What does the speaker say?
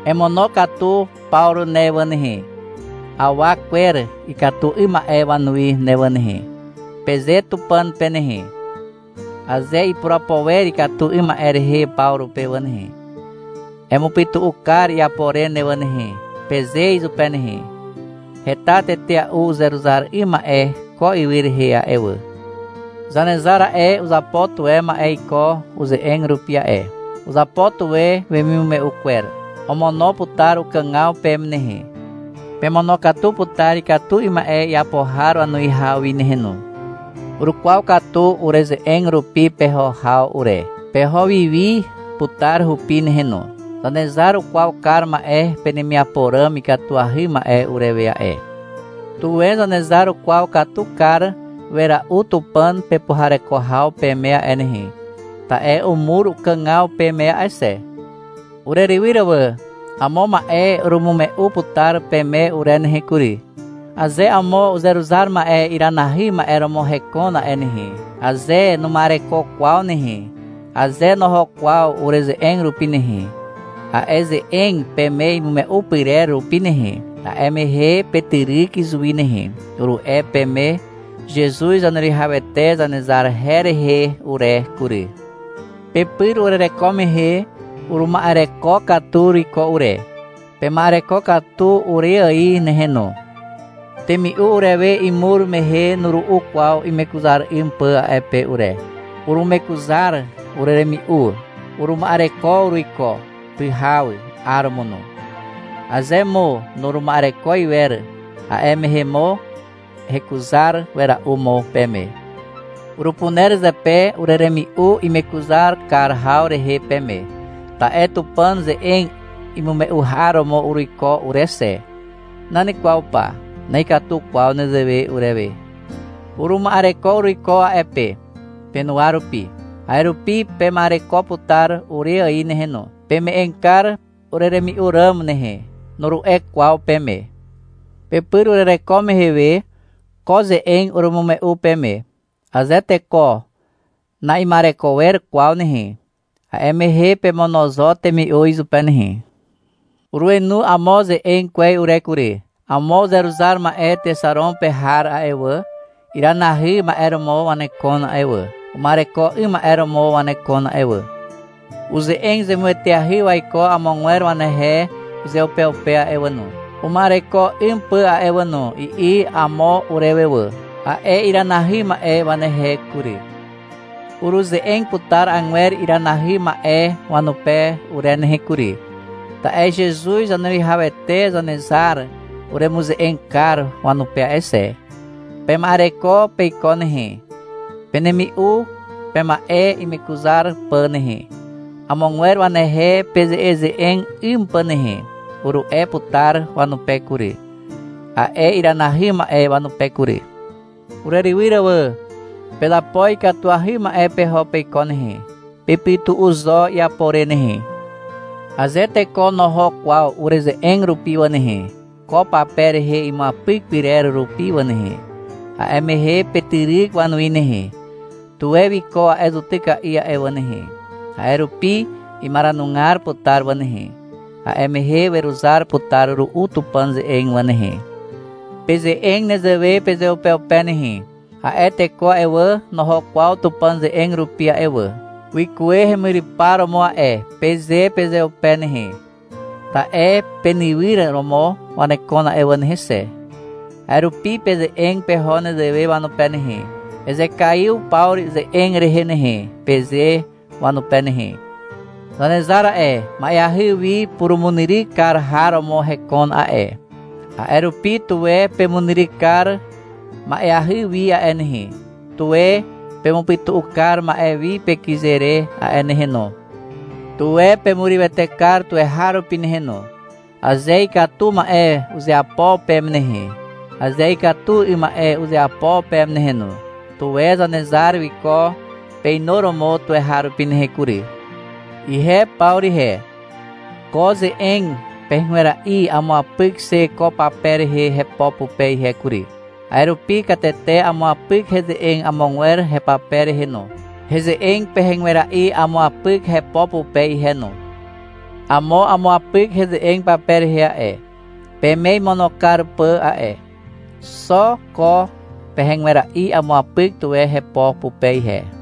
— Emonokatu Pawru ne wà nehe, awa kwer ikatu 'ym ma'e wanuwi ne wà nehe, peze Tupàn pe nehe. — Aze ipurapo wer ikatu 'ym ma'e rehe Pawru pe wà nehe, emupytu'u kar iapo re ne wà nehe, peze izupe nehe. Heta tetea'u uzeruzar 'ym ma'e ko ywy rehe a'e wà. Zanezar a'e, uzapo tuwe ma'e iko uze'eg rupi a'e. Uzapo tuwe wemimume'u kwer. Omono putar ukàgaw peme nehe, pemonokatu putar ikatu 'ym ma'e iapo har wanuwihaw wi nehe no. Urukwaw katu ureze'eg rupi peho haw ure. Peho wiwi putar hupi nehe no. Zanezar ukwaw kar ma'e penemiapo ràm ikatuahy ma'e urewe a'e. Tuwe Zanezar ukwaw katu kar wera'u Tupàn pepuhareko haw peme a'e nehe, ta'e umur ukàgaw peme a'e xe. Urerywyr wà. Amo ma'e urumume'u putar peme ure nehe kury. Aze amo uzeruzar ma'e iranahy ma'e romo hekon a'e nehe, aze numa'ereko kwaw nehe, aze noho kwaw ureze'eg rupi nehe, a'e ze'eg peme imume'u pyrer rupi nehe, a'e mehe petyryk izuwi nehe, uru'e peme Zezuz Zaneruwihawete Zanezar her rehe ure kury. Pepyr urereko mehe uruma'ereko katu uruiko ure. Pema'ereko katu ure ài nehe no. Temi'u urewe imur mehe nuru'u kwaw imekuzar 'ym pà a'e pe ure. Urumekuzar ureremi'u. Uruma'ereko uruiko, pyhaw, 'aromo no. Aze mo nuruma'ereko iwer, a'e mehe mo hekuzar wera'u mo peme. Urupuner zepe ureremi'u imekuzar kar haw rehe peme, ta'e Tupàn ze'eg imume'u har romo uruiko ure xe. Nan kwaw pa. Na'ikatu kwaw nezewe urewe. Uruma'ereko uruiko a'e pe, penuwa rupi. A'e rupi pema'ereko putar ure ài nehe no. — Peme'eg kar ureremi'u ràm nehe, nuru'e kwaw peme. Pepyr urereko mehe we, ko ze'eg urumume'u peme. — Aze teko na'ima'ereko wer kwaw nehe, a'e mehe pemono zo temi'u izupe nehe. Urenu amo ze'eg kwez ure kury. — Amo uzeruzar ma'e Texaron pe har a'e wà, iranahy ma'e romo wanekon a'e wà, uma'ereko 'ym ma'e romo wanekon a'e wà. Uze'eg zemueteahy waiko amogwer wanehe uzeupeupe a'e wà no, uma'ereko 'ym pà a'e wà no, i'i amo urewe wà, a'e iranahy ma'e wanehe kury. Uruze'eg putar agwer iranahy ma'e wanupe ure nehe kury, ta'e Zezuz Zaneruwihawete Zanezar uremuze'eg kar wanupe a'e xe. — Pema'ereko peiko nehe, penemi'u pema'e imekuzar pà nehe, amogwer wanehe peze'eze'eg 'ym pà nehe, uru'e putar wanupe kury, a'e iranahy ma'e wanupe kury. Urerywyr wà. Pezapo ikatuahy ma'e peho peiko nehe. Pepytu'u zo iapo re nehe. Aze teko noho kwaw ureze'eg rupi wà nehe, ko pape rehe imuapyk pyrer rupi wà nehe, a'e mehe petyryk wanuwi nehe. Tuwe wiko a'e zutyka'i a'e wà nehe. A'e rupi imaranugar putar wà nehe, a'e mehe weruzar putar ru'u Tupàn ze'eg wà nehe. Peze'eg nezewe pezeupeupe nehe. — A'e teko a'e wà, noho kwaw Tupàn ze'eg rupi a'e wà. Wikuwe hemyrypar romo a'e, peze pezeupe nehe. Ta'e penywyr romo wanekon a'e wà nehe xe. A'e rupi peze'eg peho nezewe wanupe nehe. — Ezekaiw Pawru ze'eg rehe nehe, peze wanupe nehe. Zanezar a'e, ma'eahy wi purumunyryk kar har romo hekon a'e, a'e rupi, tuwe pemunyryk kar ma'eahy wi a'e nehe, tuwe pemupytu'u kar ma'e wi pekyze re a'e nehe no. Tuwe pemurywete kar tuweharupi nehe no, aze ikatu ma'e uzeapo peme nehe, aze ikatu 'ym ma'e uzeapo peme nehe no. Tuwe Zanezar wiko peinuromo tuweharupi nehe kury. Ihe Pawru ihe, ko ze'eg pehegwera'i amuapyk xe ko pape rehe hepo pupe ihe kury. A'e rupi katete amuapyk heze'eg amogwer hepape rehe no, heze'eg pehegwera'i amuapyk hepo pupe ihe no. Amo umuapyk heze'eg pape rehe a'e, peme imono kar pà a'e. Xo ko pehegwera'i amuapyk tuwe hepo pupe ihe.